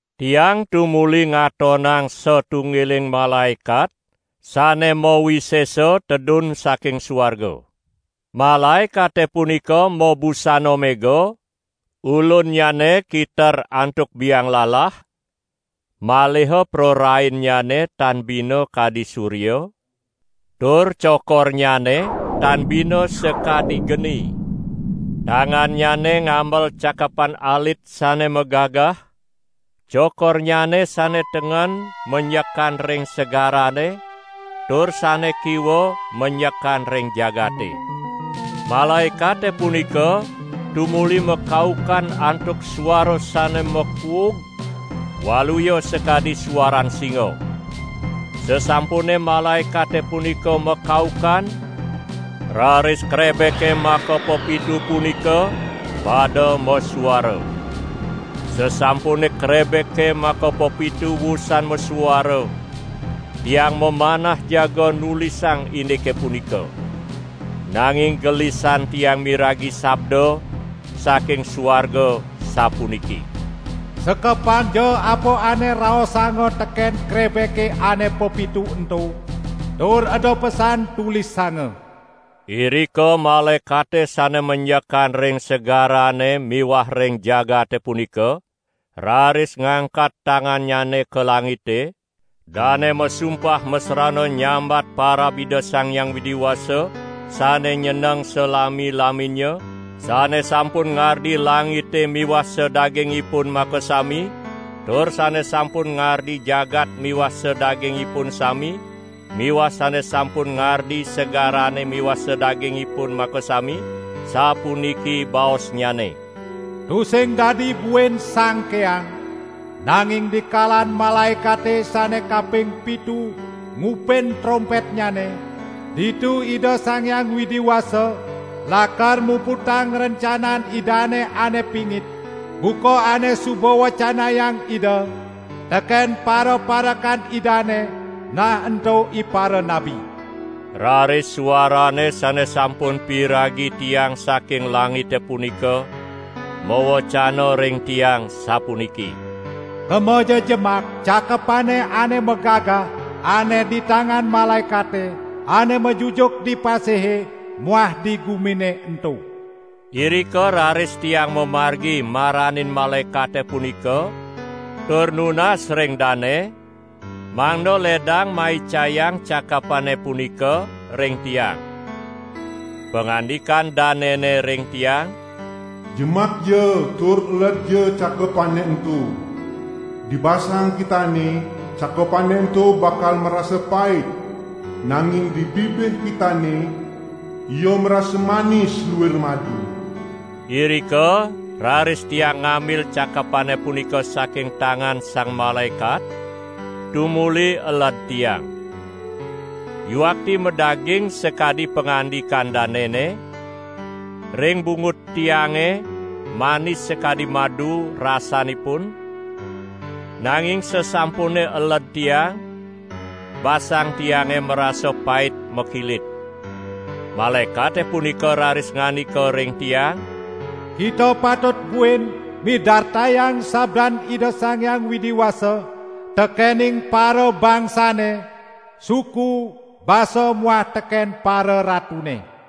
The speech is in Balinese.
Tiang tumuli ngatonang satunggiling malaekat sane mawisesa tedun saking suarga. Malaekate punika mabusana mega, ulunnyane kiter antuk biang lalah, maliha prarainnyane tan bina kadi surya, tur cokornyane tan bina sakadi geni. Tangannyane ngamel cakepan alit sane magagah. Cokornyane sane tengen menjekan ring segarane tur sane kiwa menjekan ring jagate. Malaekate punika tumuli makaukan antuk suara sane makuug waluya sakadi suaran singa. Sasampune malaekate punika makaukan, raris krebeke makapepitu punika pada masuara. Sasampune krebeke makapepitu usan masuara, tiang mamanah jaga nulisang indike punika. Nanging gelisan tiang miragi sabda saking suarga sapuniki: "Sekepangja apa ane raosanga teken krebeke ane pepitu ento, tur eda pesan tulisanga!" Irika malaekate sane menjekan ring segarane miwah ring jagate punika, raris ngangkat tangannyane ka langite, dane masumpah masrana nyambat parab Ida Sang Hyang Widi Wasa sane nyeneng salami-laminnya, sane sampun ngardi langite miwah sadagingipun makasami, tur sane sampun ngardi jagat miwah sadagingipun sami miwah sane sampun ngardi segarane miwah sadagingipun makasami, sapuniki baosnyane: "Tusing dadi buin sangkeang! Nanging dikalan malaekate sane kaping pitu ngupin trompetnyane, ditu Ida Sang Hyang Widi Wasa lakar muputang rencanan Idane ane pingit, buka ane suba wecanayang Ida teken paraparekan Idane, nah ento iparanabi." Raris suarane sane sampun piragi tiang saking langite punika mawecana ring tiang, sapuniki: "Kemaja jemak cakepane ane magagah ane di tangan malaekate ane majujuk di pasihe muah di gumine ento!" Irika raris tiang mamargi maranin malaekate punika tur nunas ring dane mangda ledang maicayang cakepane punika ring tiang. Pangandikan danene ring tiang: "Jemakja tur eledja cakepane ento. Di basang kitane cakepane ento bakal marasa pait, nanging di bibih kitane ia marasa manis luir madu." Irika raris tiang ngambil cakepane punika saking tangan sang malaekat, tumuli eled tiang. Yuakti madaging sakadi pangandikan danene: Ring bungut tiange manis sakadi madu rasanipun, nanging sasampune eled tiang, basang tiange marasa pait makilit. Malaekate punika raris ngandika ring tiang: "Kita patut buin midartayang sabdan Ida Sang Hyang Widi Wasa tekening parabangsane, suku, basa muah teken pararatune."